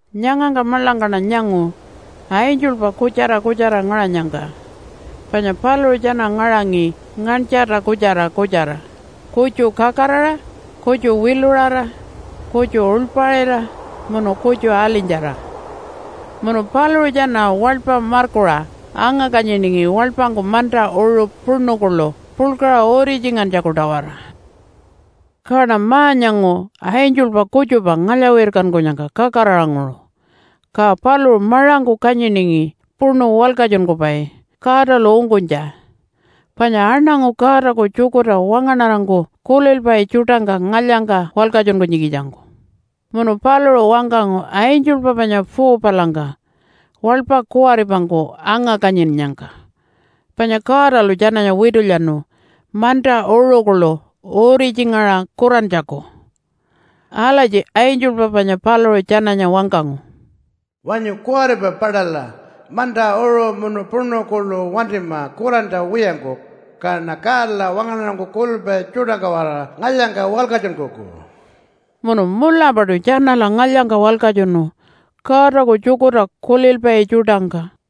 Nyangangka maḻangkaṉa nyangu angelpa kutjara kutjara ngaṟanyangka, panya paluṟu tjana ngaṟangi nganytjarta kutjara kutjara, kutju kakaraṟa, kutju wiluṟara, kutju uḻpaṟira, munu kutju alinytjara. Munu paluṟu tjana waḻpa markuṟa anga-kanyiningi waḻpangku manta uṟu puṉu kuḻu puḻkaṟa uritjingantjaku-tawara. Kaṉa ma-nyangu angelpa kutjupa ngalya-wirkankunyangka kakaraṟanguṟu. Ka paluṟu maṟangku kanyiningi puṉu walkatjunkupai Godalu ungkunytja, panya aṉangu Godaku tjukurta wangaṉarangku kulilpai tjuṯangka ngalyangka walkatjunkunytjikitjangku. Munu paluṟu wangkangu angelpa panya 4-palangka waḻpa kuwaripangku anga-kanyinnyangka, panya Godalu tjananya witulyanu manta uṟu kuḻu uritjingaṟa kurantjaku. Alatji angelpa panya paluṟu tjananya wangkangu, “Wanyu kuwaripa paṯala! Manta, uṟu, munu puṉu kuḻu wantima kurantja wiyangku, kaṉa Godala wangaṉarangku kulilpai tjuṯangka-waraṟa ngalyangka walkatjunkuku.” Munu mulapaṯu tjanala ngalyangka walkatjunu Godaku tjukurta kulilpai tjuṯangka.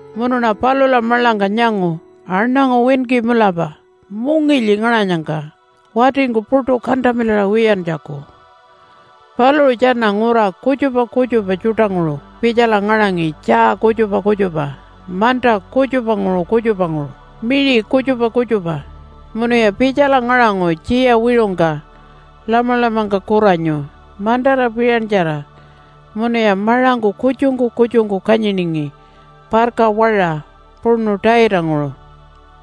Munuṉa palula maḻangka nyangu aṉangu winki mulapa mungilyi ngaṟanyangka watingku puṯu kantamilaṟa wiyantjaku. Paluṟu tjana ngura kutjupa kutjupa tjuṯanguṟu pitjala ngaṟangi tjaa kutjupa kutjupa, manta kutjupanguṟu kutjupanguṟu, miṟi kutjupa kutjupa. Munuya pitjala ngaṟangu tjiya wiṟungka Lamalamangka kuranyu mantara piṟantjara munuya maṟangku kutjungku kutjungku kanyiningi parka waṟa puṉu taitanguṟu.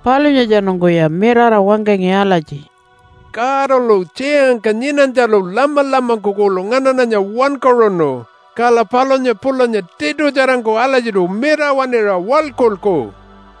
Palunyatjanungkuya mirara wangkangi alatji, “Godalu tjiyangka nyinanytjalu Lamalamangku kuḻu nganaṉanya wankaṟunu. Kala palunya pulanya tiṯutjarangku alatjiṯu mirawaṉira waḻkulku.”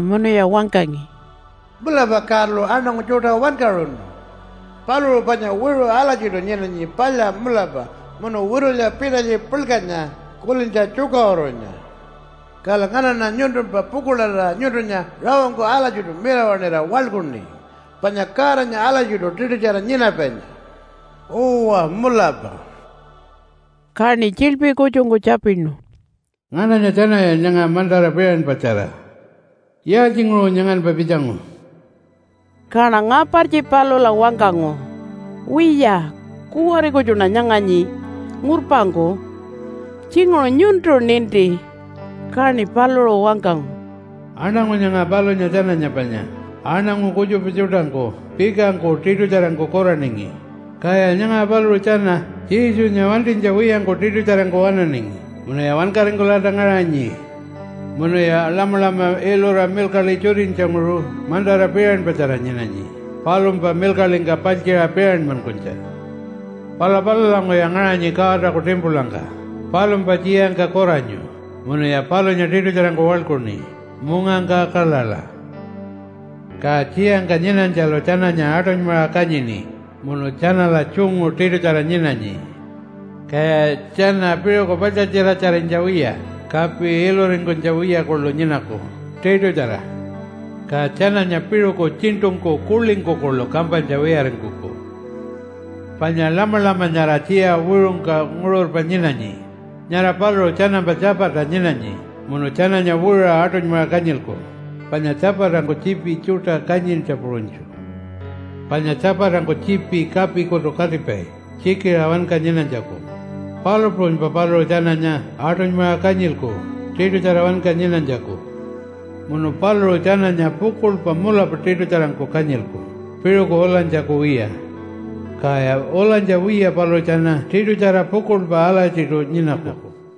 munuya wangkangi, “Mulapa Godalu aṉangu tjuṯa wankaṟunu. Paluṟu panya wiṟu alatjiṯu nyinanyi palya mulapa, munu witulya pitalytji puḻkanya, kulintja tjukaṟurunya. Kala nganaṉa nyuntumpa pukuḻarira nyuntunya rawangku alatjiṯu mirawaṉira waḻkuṉi, panya Godanya alatjiṯu tiṯutjara nyinapainya. Uwa mulapa.” Kaṉi tjiḻpi kutjungku tjapinu, “Ngananya tjanaya nyanga mantara piṟanpatjara? Yaaltjinguṟu nyanganpa pitjangu?” Kaṉa ngapartji palula wangkangu, “Wiya, kuwari kutjuṉa nyanganyi ngurpangku. Tjinguṟu nyuntu ninti.” Kaṉi paluṟu wangkangu, “Aṉangu nyanga palunya tjananya panya aṉangu kutjupa tjuṯangku pikangku tiṯutjarangku kuraningi, kaya nyanga paluṟu tjana Jesunya wantinytja wiyangku tiṯutjarangku waṉaningi munuya wankaringkulalta ngaṟanyi. Munuya Lamalama ilura milkaḻi tjutinytjanguṟu mantara piṟanpatjara nyinanyi palumpa milkaḻingka paltjiṟa piṟanmankunytja. Pala palulanguṟuya ngaṟanyi Godaku timpulangka palumpa tjiyangka kuranyu munuya palunya tiṯutjarangku waḻkuṉi mungangka kaḻaḻa. “Ka tjiyangka nyinanytjalu tjananya aṯunymaṟa kanyini munu tjanala tjungu tiṯutjara nyinanyi. Kaya tjana piṟuku paḻtjatjiratjarinytja wiya kapi iluringkunytja wiya kuḻu nyinaku tiṯutjara. Ka tjananya piṟuku tjiṉṯungku kuḻingku kuḻu kampanytja wiyaringkuku. “Panya Lamalama nyara tjiya wiṟungka nguṟurpa nyinanyi, nyara paluṟu tjanampa tjapata nyinanyi munu tjananya wiṟuṟa aṯunymaṟa kanyilku panya tjapatangku tjiipi tjuṯa kanyintja puṟunytju. Panya tjapatangku tjiipi kapikutu katipai, tjikiṟa wanka nyinanytjaku, palu puṟunypa paluṟu tjananya aṯunymaṟa kanyilku tiṯutjara wanka nyinanytjaku. Munu paluṟu tjananya pukuḻpa mulapa tiṯutjarangku kanyilku piṟuku ulanytjaku wiya. Kaya ulanytja wiya paluṟu tjana tiṯutjara pukuḻpa alatjiṯu nyinaku.”